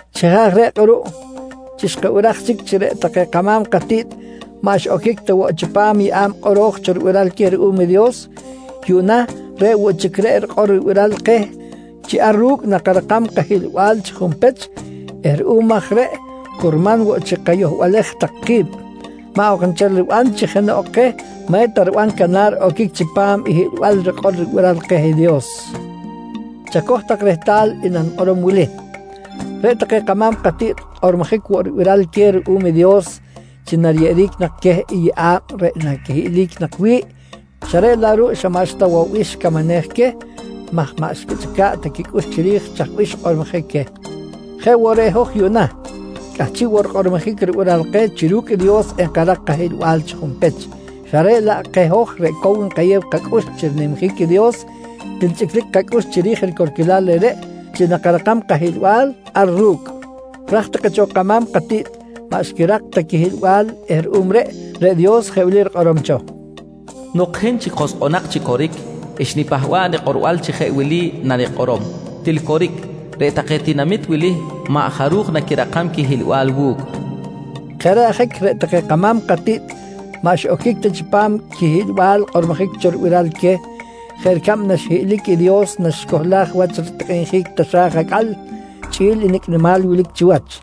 Chi jeꞌ aj reꞌ kꞌuruꞌ, chi xkabiraj chic chi reꞌ take kama̱m katiꞌt maꞌ xiꞌoquic ta woꞌ chipam i yeꞌa̱b kꞌoro̱j cho ribiral queh ruꞌum i Dios, yuꞌna reꞌ woꞌ chic reꞌ rikꞌor ribiral keh chi ar ru̱cꞌ nakarakam kahiꞌlbal chi junpech eh ruꞌum aj reꞌ curman woꞌ chi kayohbalej tak ki̱b, maꞌ ok nchel riban chi jenoꞌ keh maꞌ eta riban canar oquic chipam i hiꞌlbal rikꞌor ribiral keh i Dios. Chacoj tak rehtal i nanikꞌorom wili: Reꞌ take kama̱m katiꞌt kꞌormojic woꞌ ribiral queh ruꞌum i Dios chi nariyeꞌeric nak queh i yeꞌa̱b reꞌ naquihiꞌlic nak wi̱ꞌ, xa reꞌ laꞌ ruꞌ xa maꞌxta woꞌ bih xicamanej queh maj maꞌ xquichꞌica̱ꞌ ta quicꞌux chiri̱j chaj bih xkꞌormojic queh. Jeꞌ woꞌ reꞌ hoj yuꞌna, cꞌahchiꞌ woꞌ rikꞌormojic ribiral keh chi ru̱cꞌ i Dios enkarak kahiꞌlbal chi junpech, xa reꞌ laꞌ keh hoj reꞌ cow nkayew kacꞌux chi rinimjic i Dios til chꞌiclic kacꞌux chiri̱j i ricorquilal reꞌreꞌ chi nakarakam kahiꞌlbal ar ru̱cꞌ. Raj take cho kama̱m katiꞌt maꞌ xquirak ta quihiꞌlbal eh ruꞌum reꞌ, reꞌ Dios jeꞌ wili rikꞌorom cho: “Nok hin chic joskꞌonak chi coric, xnipahba̱ꞌ nikꞌorbal chi jeꞌ wili nanikꞌorom: Til coric, reꞌ take tinamit wili maꞌ jaruj naquirakam quihiꞌlbal wu̱cꞌ, nqui rikꞌorom cho. Jeꞌ reꞌ ajic reꞌ take kama̱m katiꞌt maꞌ xiꞌoquic ta chipam quihiꞌlbal xkꞌormojic cho ribiral queh jeꞌ ricab naxhiꞌlic i Dios naxicohlaj wach ritikꞌinjic taxa̱j acꞌal chꞌi̱l i nicꞌ nimal wilic chiwach.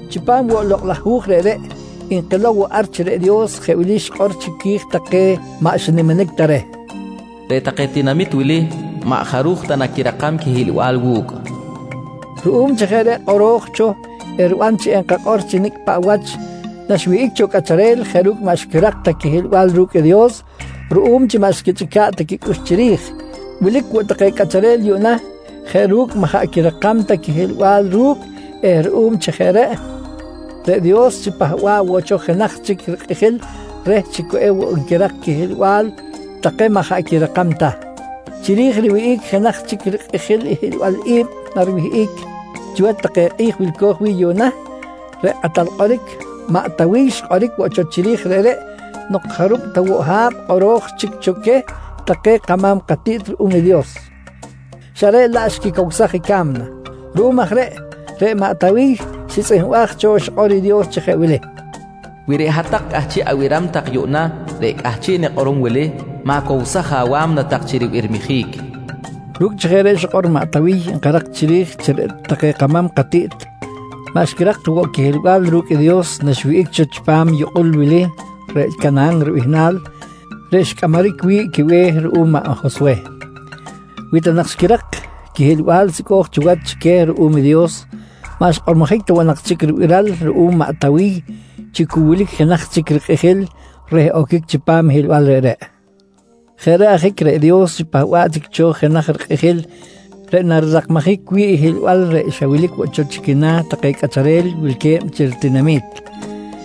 Chipam woꞌ i lokꞌ laj hu̱j reꞌreꞌ nkilow woꞌ ar chi reꞌ Dios jeꞌ wili xikꞌor chiqui̱j take maꞌ xiniminic ta reh: “Reꞌ take tinamit wili maꞌ jaruj ta naquirakam quihiꞌlbal wu̱cꞌ, nqui xikꞌor. Ruꞌum chi jeꞌ reꞌ kꞌoro̱j cho eriban chi enkakꞌor chi nicꞌ paꞌ wach naxiwihꞌic cho cꞌacharel jeꞌ ru̱cꞌ maꞌ xquirak ta quihiꞌlbal ru̱cꞌ i Dios ruꞌum chi maꞌ xquichꞌica̱ꞌ ta quicꞌux chiri̱j, wilic woꞌ take cꞌacharel yuꞌna jeꞌ ru̱cꞌ maꞌ jaꞌ quirakam ta quihiꞌlbal ru̱cꞌ eh ruꞌum chi jeꞌ reꞌ, reꞌ Dios xipahba̱ꞌ woꞌ cho jenaj chic rikꞌijil reh chi cu ewoꞌ nquirak quihiꞌlbal take maꞌ jaꞌ quirakam ta. Chiri̱j riwihꞌic jenaj chic rikꞌijil i hiꞌlbal i̱b nariwihꞌic chiwach take kꞌi̱j wilco̱j wi̱ꞌ yuꞌna, reꞌ kꞌatal kꞌoric maꞌ Tawiy xkꞌoric woꞌ cho chiri̱j reꞌreꞌ nok jarub ta woꞌ ha̱b kꞌoro̱j chic cho queh take kama̱m katiꞌt ruꞌum i Dios, xa reꞌ laꞌ xquicowsaj i ca̱mna. Ruꞌum aj reꞌ, reꞌ maꞌ Tawiy xitzꞌihmbaj cho i xikꞌor i Dios chi jeꞌ wili: “Wi reꞌ hat-tak cꞌahchiꞌ abiram tak yuꞌna reꞌ cꞌahchiꞌ nikꞌorom wili, ma̱cowsaj awa̱mna tak chi ribirmijic, nqui xikꞌor. Ru̱cꞌ chi jeꞌ reꞌ xikꞌor maꞌ Tawiy nkarak chiri̱j chi reꞌ take kama̱m katiꞌt maꞌ xquirak ta woꞌ quihiꞌlbal ru̱cꞌ i Dios naxiwihꞌic cho chipam yukꞌul wili reꞌ Canahan ribihnal reꞌ xcꞌamaric wi̱ꞌ quibe̱h ruꞌum maꞌ Joswe. Wi ta nak xquirak quihiꞌlbal sicꞌo̱j cho wach chi queh ruꞌum i Dios, maꞌ xkꞌormojic ta woꞌ nak chic ribiral ruꞌum maꞌ Tawiy chi cu wilic jenaj chic rikꞌijil reh oquic chipam i hiꞌlbal reꞌreꞌ. Jeꞌ reꞌ ajic reꞌ Dios xipahba̱ꞌ chic cho jenaj rikꞌijil reꞌ narirakmajic wi̱ꞌ i hiꞌlbal reꞌ xa wilic woꞌ cho chi quina̱ take cꞌacharel wilque̱b chi ritinami̱t.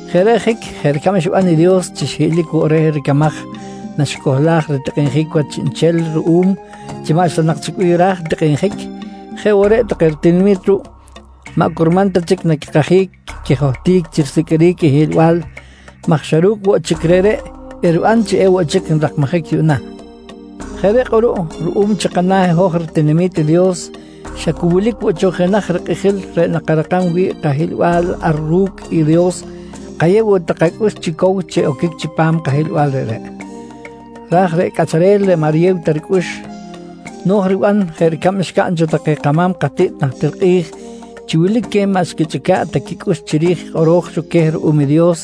Jeꞌ reꞌ ajic jeꞌ ricab xiban i Dios chi xhiꞌlic woꞌ reh ricamaj naxicohlaj ritikꞌinjic wach chiꞌnchel ruꞌum chi maꞌxta nak chic bih raj tikꞌinjic jeꞌ woꞌ reꞌ take ritinami̱t ruꞌ maꞌ curman ta chic naquikajic quijohtic chi risiqꞌuiric i hiꞌlbal maj xa ru̱cꞌ woꞌ chic reꞌreꞌ eriban chi ewoꞌ chi nrakmajic yuꞌna. Jeꞌ reꞌ kꞌuruꞌ ruꞌum chi kana̱ i hoj ritinami̱t i Dios xa cu wilic woꞌ cho jenaj rikꞌijil reꞌ nakarakam wi̱ꞌ kahiꞌlbal ar ru̱cꞌ i Dios, kayew woꞌ tak kacꞌux chi cow chi oquic chipam i kahiꞌlbal reꞌreꞌ. Raj reꞌ cꞌacharel maꞌ riyew ta ricꞌux, no̱j riban jeꞌ ricab xcaꞌn cho take kama̱m katiꞌt najtir kꞌi̱j chi wilic queh maꞌ xquichꞌica̱ꞌ ta quicꞌux chiri̱j i kꞌoro̱j cho queh ruꞌum i Dios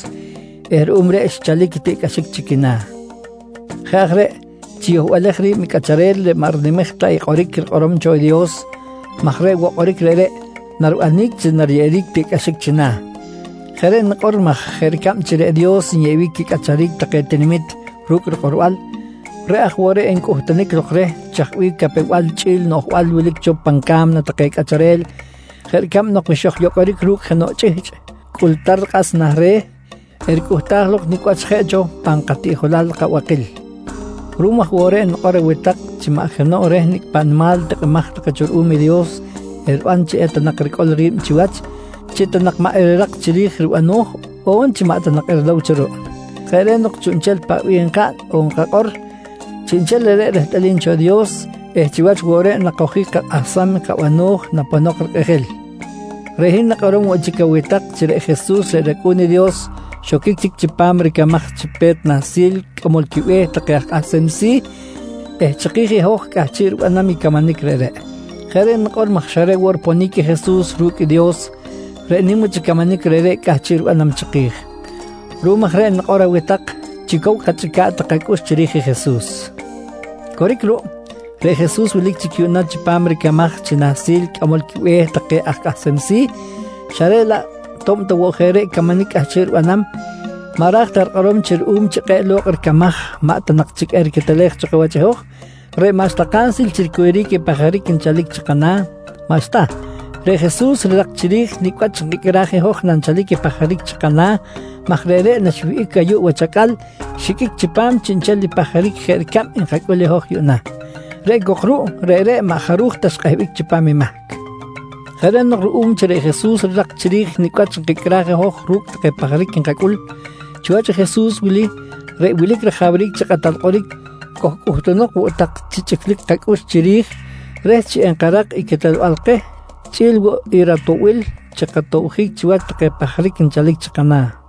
eh ruꞌum reꞌ xchalic i tiꞌcꞌaxic chi quina̱. Jeꞌ aj reꞌ chiyohbalej ri̱b i cꞌacharel reꞌ maꞌ rinimej ta i kꞌoric rikꞌorom cho Dios maj reꞌ woꞌ kꞌoric reꞌreꞌ naribanic chi nariyeꞌeric tiꞌcꞌaxic china̱. Jeꞌ reꞌ nikꞌor maj jeꞌ ricab chi reꞌ Dios nyeꞌbic quicꞌacharic take tinamit ru̱cꞌ rikꞌorbal, reꞌ aj woꞌ reꞌ ncꞌuhtunic lok reh chaj bih capew-bal chꞌi̱l noꞌjbal wilic cho pan ca̱mna take cꞌacharel jeꞌ ricab nok wi xojyocꞌoric ru̱cꞌ jenoꞌ chꞌihchꞌ cꞌultar kꞌas nah re̱, ericꞌuhtaj lok nicꞌ wach jeꞌ cho pan katiꞌjolal kabakil. Ruꞌum aj woꞌ reꞌ nikꞌor aweh tak chi maꞌ jenoꞌ reh nicꞌ paꞌ nimal tikꞌimaj take cho ruꞌum i Dios eriban chi ta nak ericꞌol ri̱b chiwach, chi ta nak maꞌ erirak chiri̱j i ribano̱j on chi maꞌ ta nak erilow cho ruꞌ. Jeꞌ reꞌ nok chiꞌnchel paꞌ bih nkaꞌn on nkakꞌor, chiꞌnchel reꞌreꞌ rehtꞌalim cho i Dios eh chiwach woꞌ reꞌ nakojic kakꞌahsam i kabano̱j naponok rikꞌijil. Reꞌ hin nikꞌorom woꞌ chic aweh tak chi reꞌ Jesus reꞌ rAcꞌu̱n i Dios xoquic chic chipam ricamaj chi Pe̱t Nahsil Cꞌamol quiBe̱h take aj kꞌahsem si̱ eh chiki̱j i hoj cꞌahchiꞌ ribanam i camanic reꞌreꞌ. Jeꞌ reꞌ nikꞌor maj xa reꞌ woꞌ riponic i Jesus ru̱cꞌ i Dios, reꞌ nim wach i camanic reꞌreꞌ cꞌahchiꞌ ribanam chiki̱j. Ruꞌum aj reꞌ nikꞌor aweh tak chi cow kachꞌica̱ꞌ tak kacꞌux chiri̱j i Jesus. Coric ruꞌ, reꞌ Jesus wilic chic yuꞌna chipam ricamaj chi Nahsil Cꞌamol quiBe̱h take aj kꞌahsem si̱, xa reꞌ laꞌ to̱b ta woꞌ jeꞌ reꞌ camanic cꞌahchiꞌ ribanam, maꞌ ra̱j ta rikꞌorom chi ruꞌum chi kꞌe̱ꞌ lo̱kꞌ ricamaj maꞌ ta nak chic eriquetelej cho kawach i hoj reꞌ maꞌxta kansil chi ricuyuric i pajaric nchalic chi kana̱. Maꞌxta, reꞌ Jesus rirak chiri̱j nicꞌ wach nkicꞌraj i hoj nanchalic i pajaric chi kana̱ maj reꞌreꞌ naxwihꞌic ayuꞌ wach acꞌal xiqꞌuic chipam chiꞌnchel i pajaric jeꞌ ricab nkacꞌul i hoj yuꞌna. Reꞌ cok ruꞌ reꞌreꞌ maꞌ jaruj ta xkꞌehbic chipam i mahc. Jeꞌ reꞌ nok ruꞌum chi reꞌ Jesus rirak chiri̱j nicꞌ wach nkicꞌraj i hoj ru̱cꞌ take pajaric nkacꞌul, chiwach i Jesus wili reꞌ wilic rajawric chi Kꞌatal Kꞌoric kojcꞌuhtunok woꞌ tak chi chꞌiclic kacꞌux chiri̱j reh chi enkarak i quetelbal keh chꞌi̱l woꞌ i ratoꞌbil chi katobjic chiwach take pajaric nchalic chi kana̱.